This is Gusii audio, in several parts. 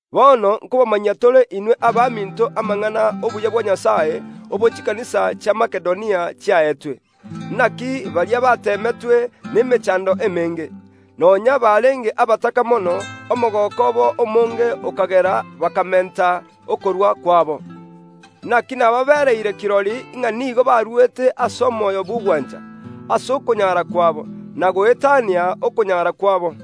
Bono nkobamanyia tore inwe abaminto amang’ana y’obuya bwa Nyasae, obo chikanisa chia Makedonia chiaetwe. Naki baria bateemetwe nemechando emenge. Nonya barenge abataka mono, omogooko obo omonge okagera bakamenta okorua kwabo. Naki nababereire kirori ng’a nigo baruete ase omoyo bw’ogwancha, ase okonyara kwabo, na goetania okonyara kwabo.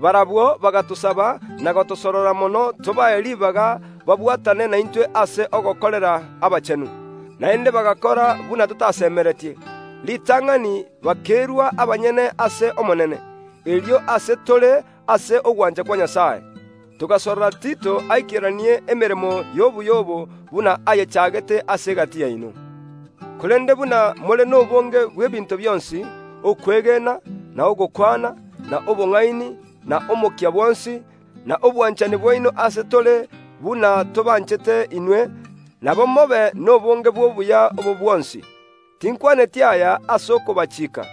Barabwo bagatosaba na gotosorora mono tobae ribaga babwatane naintwe ase ogokorera abachenu. Naende bagakora buna totasemeretie; ritang’ani bakerua abanyene ase Omonene, erio ase tore ase ogwancha kwa Nyasae. Togasorora Tito aikeranie emeremo y’obuya obo buna ayechagete ase egati yaino. Korende buna more nobonge bw’ebinto bionsi: okwegena, na ogokwana, na obong’aini, na omokia bwonsi, na obwanchani bwaino ase tore buna tobanchete inwe, nabo mobe nobonge bw’obuya obo bwonsi. Tinkwaneti aya ase okobachiika,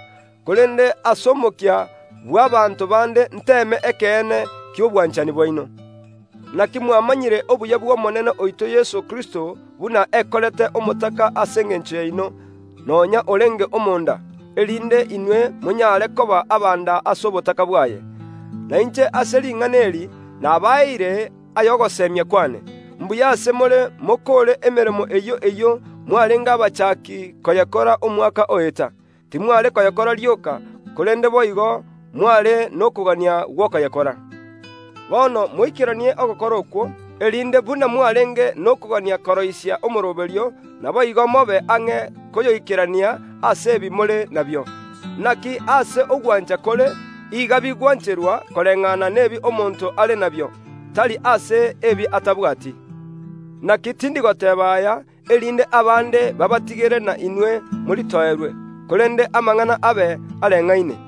korende ase omokia bw’abaanto bande nteeme ekeene ki’obwanchani bwaino. Naki mwamanyire obuya bw’Omonene oito Yeso Kristo buna ekorete omotaka ase engencho yaino, nonya orenge omonda, erinde inwe monyare koba abanda ase obotaka bwaye. Na inche ase ring’ana eri nabaeire ay’ogosemia kwane, mbuya ase more mokoore emeremo eyio eyio mwarenge abachaki koyekora omwaka oeta. Timware koyekora rioka, korende boigo mware nokogania gw’okoyekora. Bono moikeranie ogokora okwo, erinde buna mwarenge nokogania koroisia omooroberio, naboigo mobe ang’e koyoikerania ase ebi more nabio. Naki aase ogwancha kore, iga bigwancherwa koreng’ana nebi omonto are nabio, tari ase ebi atabwati. Naki tindi goteeba aya, erinde abande baabatigere na inwe moritoerwe, korende amang’ana abe areng’aine.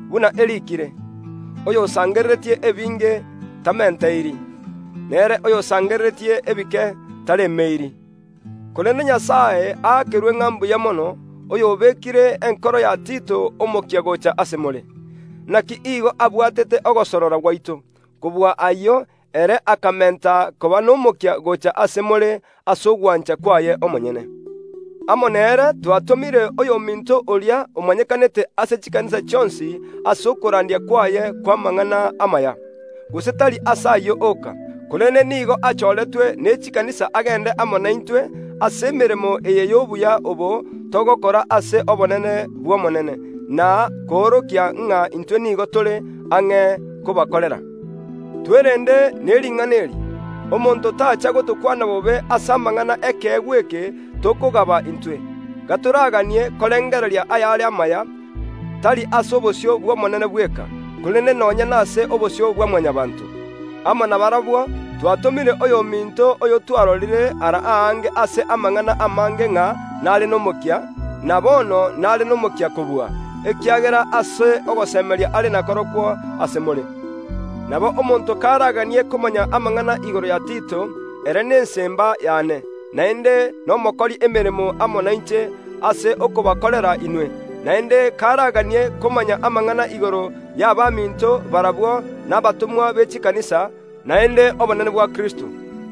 Buna eriikire, “Oyosangereretie ebinge tamenteiri, nere oyosangereretie ebike taremeiri.” Korende Nyasae aakerwe ng’a mbuya mono, oyobekire enkoro ya Tito omokia gocha ase more. Naki igo abwatete ogosorora gwaito; kobua ayio, ere akamenta koba nomokia gocha ase more ase ogwancha kwaye omonyene. Amo nere twatomire oyominto oria omanyekanete ase chikanisa chionsi ase okorandia kwaye kw’amang’ana amaya. Gose tari ase ayio oka, korende nigo achoretwe ne chikanisa agende amo naintwe ase emeremo eye y’obuya obo togokora ase obonene bw’Omonene, na koorokia ng’a intwe nigo tore ang’e kobakorera. Twerende ne ring’ana eri, omonto tacha gotokwana bobe ase amang’ana y’ekeegwa eke tokogaba intwe. Gatoraganie korengereria ayare amaya, tari ase obosio bw’Omonene bweka, korende nonya nase obosio bwa Mwanyabaanto. Amo nabarabwo twatomire oyominto oyotwarorire ara aange ase amang’ana amange ng’a nare nomokia, na bono nare nomokia kobua, ekiagera ase ogosemeria are nakorokwo ase more. Nabo omonto karaganie komanya amang’ana igoro ya Tito; ere nesemba yane, naende nomokori emeremo amo nainche ase okobakorera inwe; naende karaganie komanya amang’ana igoro y’abaminto barabwo nabatomwa be chikanisa, naende obonene bwa Kristo.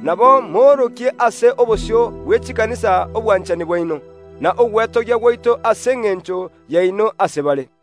Nabo moorokie ase obosio bwe chikanisa obwanchani bwaino, na ogwetogia gwaito ase engencho yaino ase bare.